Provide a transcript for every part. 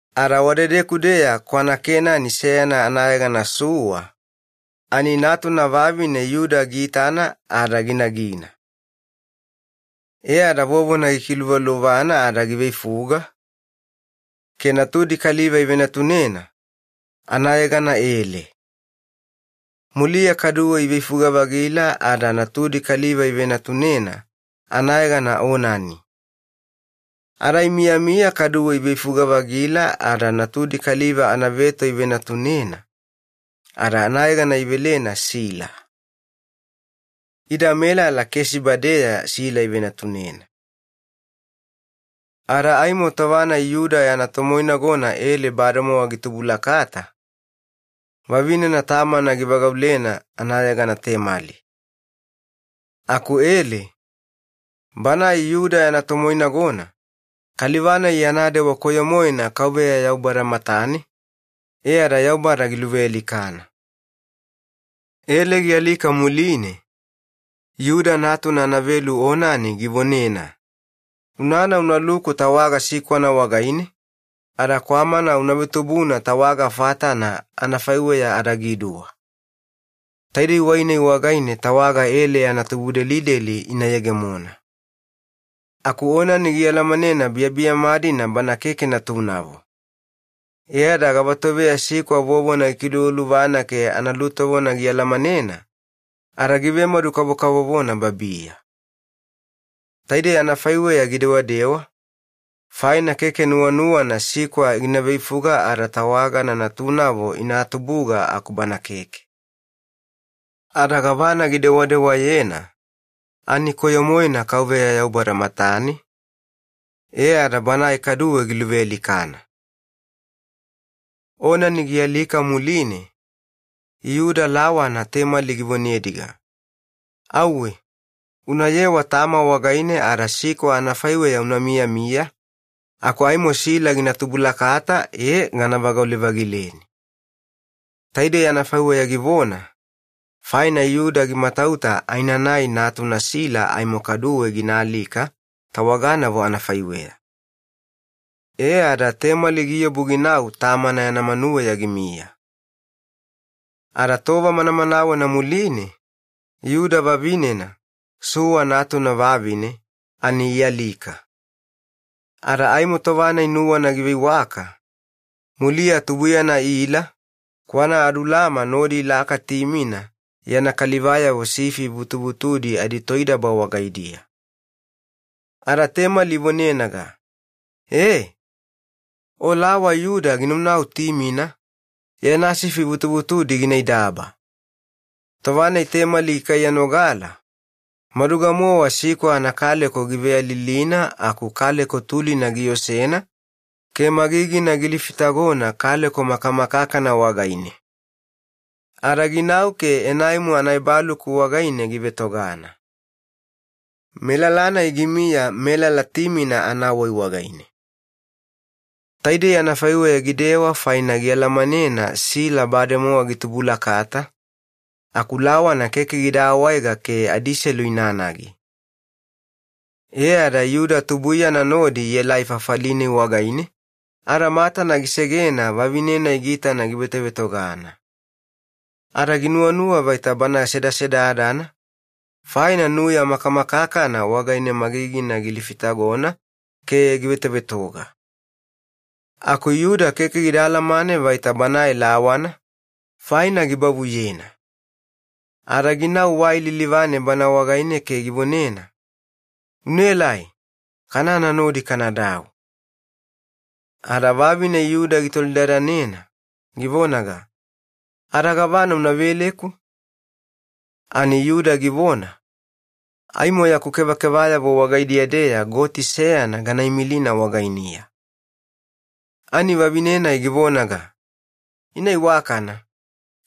Ada wadedeku-deya kwanaKenani seyana anayegana Sua ani natuna vavine Yuda ginuwagana ke ginagina. E ada vovona gikiluvaluvana ada giveifuga ke natudi kaliva ivenatunena, anayegana Ele. Muliya kaduwe iveifuga-vagila ada natudi kaliva ivenatunena, anayegana Onani. Imiyami kaduwe iveifuga-vagila ada natudi kaliva anaveto ivenatunena, ada anayegana ivelena Sila. Ida melala Kesiba-deya Sila ivenatunena. Ada aimo tova-nai Yuda yana tomoinagona Ele bademowa gitubulakata, vavinena tamana givagaulena anayegana Temali. Aku Ele, banae Yuda yana tomoinagona, kaliva-nai yana dewa koyo-moena Yaubada matane, e ada Yaubada giluvealikana. Ele gialika muline, Yuda natuna anaveto Onani givonena, “Unana, unaluku tawaga sikwana wagaine ada kwamana una vetubuna tawaga fatana, anafaiweya adagiduwa. Taidei wai-nai wagaine tawaga Ele yana tubudelideli ina yegemona.” Aku Onani gialamanena biyabiyama-dina bana keke natunavo, ada tova-nai sikwa vovona gikiluvaluvana ke analutovona gialamanena ada givemadu-kavovona babiya. Anafaiweya gidewadewa vuvuna keke nuwanuwana sikwa gina veifuga ada tawagana natunavo ina tubuga aku bana keke. Ada gavana gidewedewena ani koyo-moena Yaubada matane, e ada banae kaduwe giluvealikana. Onani gialika muline Yuda lawana Temali givonenaga, “Auwe unayewa tama wagaine ada sikwa anafaiweya una miyamiya aku Sila gina tubulakata e gana vagaule-vagileni.” Taidei anafaiweya givona faina Yuda gimatauta aenanai natuna Sila aimo kaduwe ginaalika tawaganavo anafaiweya. E ada Temali giobu ginau tamana wagaine ginamiya. Ada tova manamanawena muline Yuda vavinena, Sua natuna vavine, ani ialika. Tova-nai nuwana giveiwaka muliya tubuiyana Ila, kwanaAdulama nodi ilaka Timina yana kalivayavo sifi vutuvutudi aditoidaba wagaidiya. Ada Temali ivonenaga, “E! O lawa Yuda ginaunau Timina, yana sifi vutuvutudi ginaidaba.” Tova-nai Temali gikaiyanogala, maduga-mowa sikwa anakaleko giveyalilina aku kaleko tulina giosena ke magigina gilifitagona kaleko makamakakana wagaine ada lawana gina bavuyena vaita seyana tosedada. Ada ginau ke Enaimu anaebaluku wagaine givetogana. Melala-nai gimiya melala Timina anawai wagaine. Taidei anafaiweya gidewa faina ginuwanuwa Sila bademowa gitubulakata aku lawana keke gida awaega ke adiselu inanagi. E ada Yuda tubuiyana nodi ielai fafali-nai wagaine, ada matana gisegena vavine-nai giitana givetovetogana, ada ginuwanuwa vaita bana sedasedadana. Faina nuya makamakakana wagaine magigina gilifitagona ke wai lilivane givetovetoga. Aku Yuda keke gida alamane vaita banae lawana, gibavuyena faina ada ginau wagaine ke givonena, “Unaelai, kanana nodi kanadau.” Ada vavine Yuda gitolidadanena, givonaga, “Ada gavana una veleku?” Ani Yuda givona, “Aimo yaku kevakevayavo wagaidiya-deya goti seyana ganaimilina wagainiya.” Ani vavine-nai givonaga, “Ina iwakana,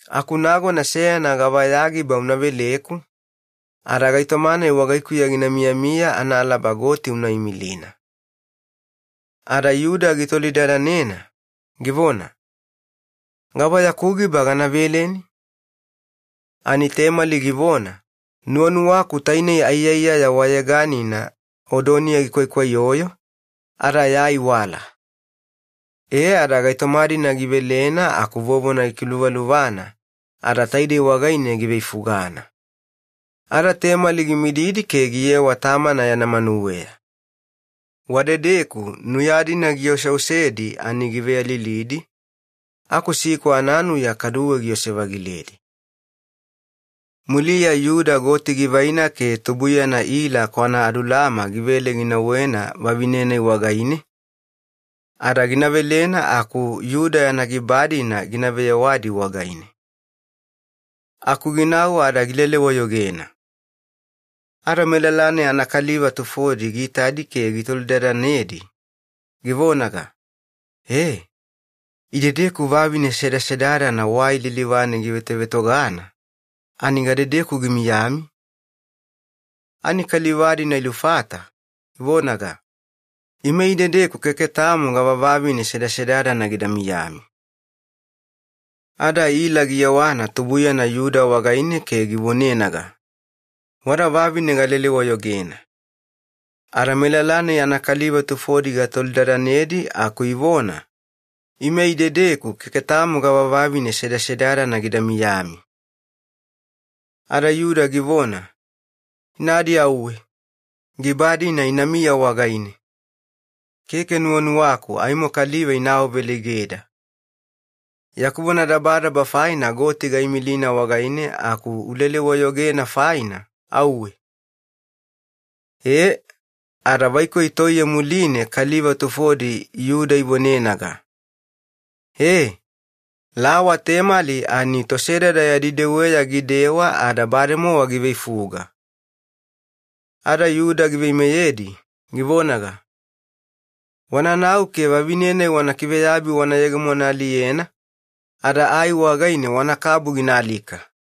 aku nagona seyana gava ya giba una veleku, ada gaitoma-nai wagaikuya gina miyamiya gava tutuya goti una imilina.” Ada Yuda gitolidadanena, givona, “Gava yaku giba gana veleni?” Ani Temali givona, “Nuwanuwaku tainei aiyaiyaya wayeganina odoniya gikwaikwaiyoyo, ada ya aiwala.” E ada gaitoma-dina givelena, aku vovona gikiluvaluvana ada taidei wagaine giveifugana. Ada Temali gimididi ke giyewa tamana yana manuweya. Wadedeku nuya-dina gioseosedi ani giveyalilidi, aku sikwa ananuya kaduwe giose-vagiledi. Muliya Yuda goti givaina ke tubuiyana Ila kwanaAdulama givele ginauwena vavine-nai wagaine, ada gina velena aku Yuda yana giba-dina gina veyewadi wagaine. Aku ginau ada gilele-wayogena. Ada melala-nai anakaliva tufodi giitadi ke gitolidadanedi, givonaga, “E! Idedeku vavine sedasedadana wai lilivane givetovetogana ani gadedeku gimiyami?” Ani kaliva-dina ilufata, ivonaga, “Ime idedeku keke tamo gava vavine sedasedadana gida miyami.” Ada Ila giyewana tubuiyana Yuda wagaine ke givonenaga, “Wada vavine galele-wayogena, ada melala-nai anakaliva tufodi gatolidadanedi aku ivona, 'Ime idedeku keke tamo gava vavine sedasedadana gida miyami.'” Ada Yuda givona, “Inadi auwe giba-dina inamiya wagaine. Keke nuwanuwaku aimo kaliva ina awaveleigeda. Yaku vonadabadaba faina goti gaimilina wagaine aku ulele-wayogena faina, auwe!” E, ada vaikoi toiye muline kaliva tufodi Yuda ivonenaga, “E! Lawa Temali ani tosedada yadi deweya gidewa ada bademowa giveifuga.” Ada Yuda giveimeyedi, givonaga, “Wananau ke vavine-nai wana kiveyabi wana yegemonaaliyena ada ai wagaine wanakabu ginaalika!”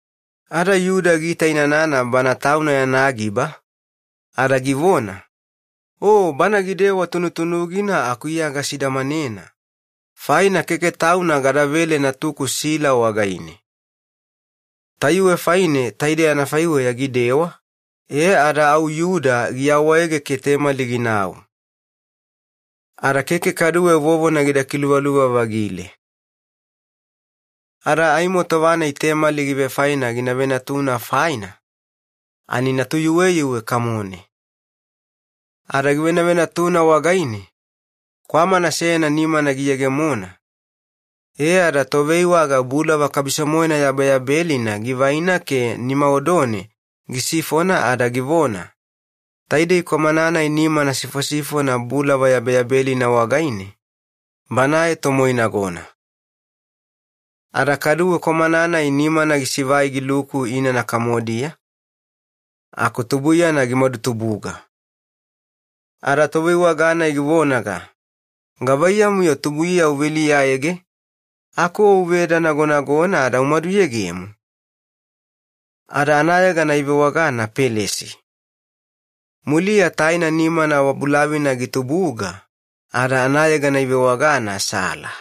Ada Yuda giitainanana bana tauna yana giba, ada givona, “O bana gidewa tunutunugina aku iya gasidamanena, faina keke tauna gadavele natuku Sila wagaine.” Tayuwe faine taidei anafaiweya gidewa, ada au giawaege ginau. Ada muliya keke kaduwe vovona gida kiluvaluva-vagile. Ada aimo tova-nai Temali givefaena gina venatuna faina ani natuyuweyuwe kamone. Ada givenavenatuna wagaine kwamana seyana nimana giyegemona, e ada toveiwaga bulava yabeyabelina givaina ke nima odone gisifona ada givona, “Taidei kwamana-nai nimana sifosifona bulava yabeyabelina wagaine, banae tomoinagona.” Ada kaduwe nimana gisivai giluku inana kamodiya, aku tubuiyana gimadutubuga. Ada toveiwaga-nai givonaga, “Gavaiyamu-yo tubuiya uveliyaege, aku o uve edanagonagona ada umaduyegemo?” Ada anayegana ivewagana Pelesi. Muliya taina nimana wabulavina gitubuga, ada anayegana ivewagana Sila.